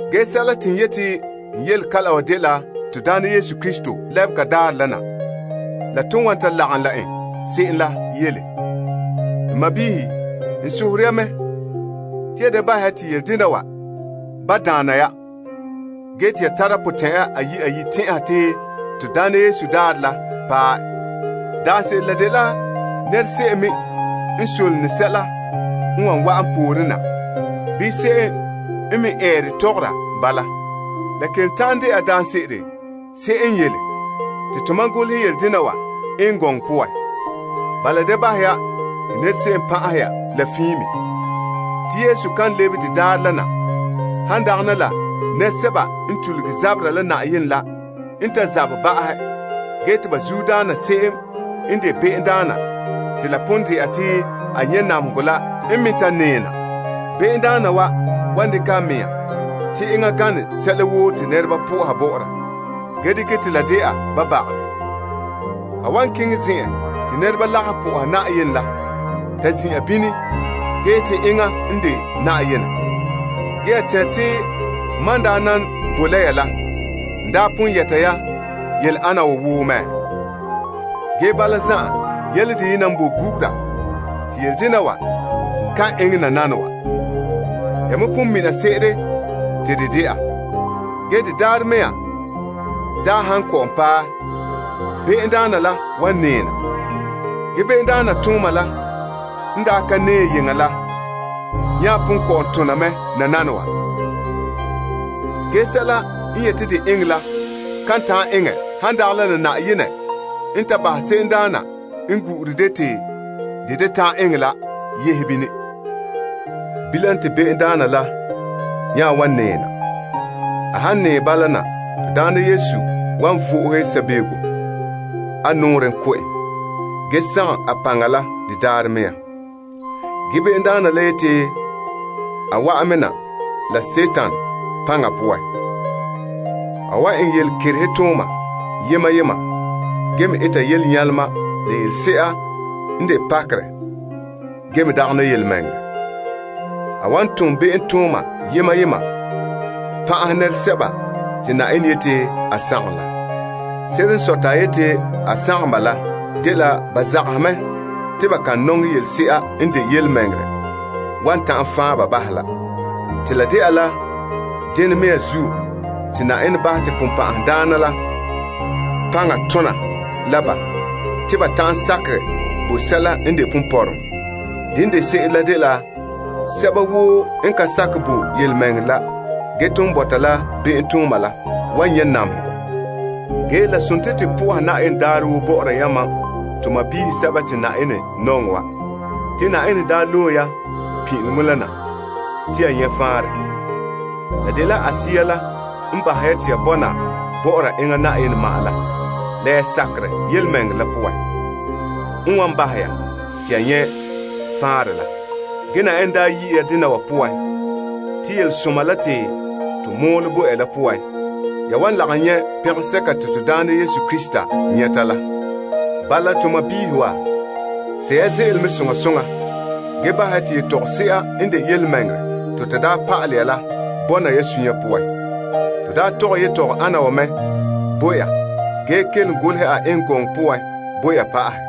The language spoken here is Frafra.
Ge sɛla te n yeti n yele kalam wa dela to Na'ayenɛ Yesu Krista lebega daarɛ la na, la ton wan ta lagom la en se'em la yele. N sɔɔnrɔ, n sohore ya mɛ, te ya da bahɛ ya te yele dena wa ba daana ya ge te ya tara potɛn'ɛra ayi' ayi' tɛn'ɛha te Na'ayenɛ daarɛ la paɛ. Daanse'ere la dela nɛra se'em me n solone sɛla n wa wa'an pooren na bii se'em n me eere tɔgɔra bala. La kelom ta'an dɛna se'em n yele, te tomam golehɛ yele dena wa eŋɛ gɔŋɔ poan. Bala, da bahɛ ya te nɛra se'em pan'ahɛ ya la fiin me. Te Yesu kan lebe de daarɛ la na han dagana la nɛresɛba n tuluge zabera la Na'ayenɛ la n ta zabɛ ba'ahɛ ge te ba zuodaana se'em n de Be'emdaana te la pon dɛna te a nyɛ' namehegɔ la n me ta nɛɛ na. Be'emdaana wa wan dekɛ a mɛŋa te enŋa gane sɛla woo te nɛreba po'oha bɔ'ɔra ge dekɛ te la dɛna ba baga. A wan keŋɛ Yenɛ Yire la ta zin'an bini ge yeti enŋa n de Yenɛ. Ge ya tɛnre te mam n daa nan boe la ya la, n daa pon yɛta ya yele ana wa woo mɛ? Ge bala zan'an, yele deyena n boe gu'ura te yele dena wa kan eŋɛ nananawa. Ya me pon mina se'ere te de dɛna. De daarɛ mea han kɔ'ɔn paɛ, be'emdaana la wan nɛɛ na. Ge be'emdaana tooma la n daa ka nɛɛ yeŋa la nya pon kɔ'ɔn tona mɛ nananawa. Ge, sɛla n yete de eŋɛ la kan ta'an eŋɛ han dagana la Yenɛ n ta bahɛ se'emdaana n gu'ure de te de da ta'an eŋɛ la yehe bini. Bilam te be'emdaana la nya wan nɛɛ na. A han nɛɛ bala, Na'ayenɛ Yesu wan vo'ohe sabego a nɔɔrɛn ko' en. Ge a nɛɛhom la de daarɛ la me sagom en. Ge be'emdaana la yete a wa'an me na la Dima la paŋa poan. A wan eŋɛ yelekerehe tooma la yelenyalema n dagɛ yelemɛŋɛrɛ. A wan ton be'emtooma yema yema pan'ahɛ sɛba n ye'ehe sagom la poan. Ba ye'ehe sagom la poan la dela ba zagahɛ mɛ te ba kan nɔŋɛ yelese'a n de yelemɛŋɛrɛ wan ta'an fan' ba bahɛ la. Te dena me zuo te Yenɛ bahɛ te Sagona la paŋa tona la ba te ba ta'an sakɛ bo sɛla n de ponpɔrɔŋɔ. Dene de se'ere la dela sɛba woo n ka sakɛ bo yelemɛŋɛrɛ la ge ton bɔta la be'emtooma la wan nyɛ' namehegɔ. Ge la dela to po'oha Yenɛ daarɛ woo bɔ'ɔra yamam to sɔɔnrɔ sɛba te Na'ayenɛ nɔŋɛ wa. Te Yenɛ daa loe ya pin'ileŋɔ na te ya nyɛ' faanrɛ. La dela a Sea la n bahɛ ya te ya bɔna bɔ'ɔra enŋa Yenɛ ma'an la la ya sakerɛ yelemɛŋɛrɛ la poan, n wan bahɛ ya te ya nyɛ' faanrɛ la. Ge Yenɛ daa yi' ya dena wa poan, te yelesoma la te to mɔɔlɛ bo ya la poan, ya wan lagom nyɛ' pɛngɛsɛka te to Na'ayenɛ Yesu Krista nyɛta la. Bala, to sɔɔnrɔ wa, sɛ' ya ze'ele mɛ soŋa soŋa ge bahɛ ya te yetɔgɔse'a n de yelemɛŋɛrɛ te to daa pa'alɛ ya la bɔna ya suunre poan. To daa tɔgɛ yetɔgɔ'ana wa mɛ bo ya ge kelom golehɛ a eŋɛ gɔŋɔ poan bo ya pa'ahɛ.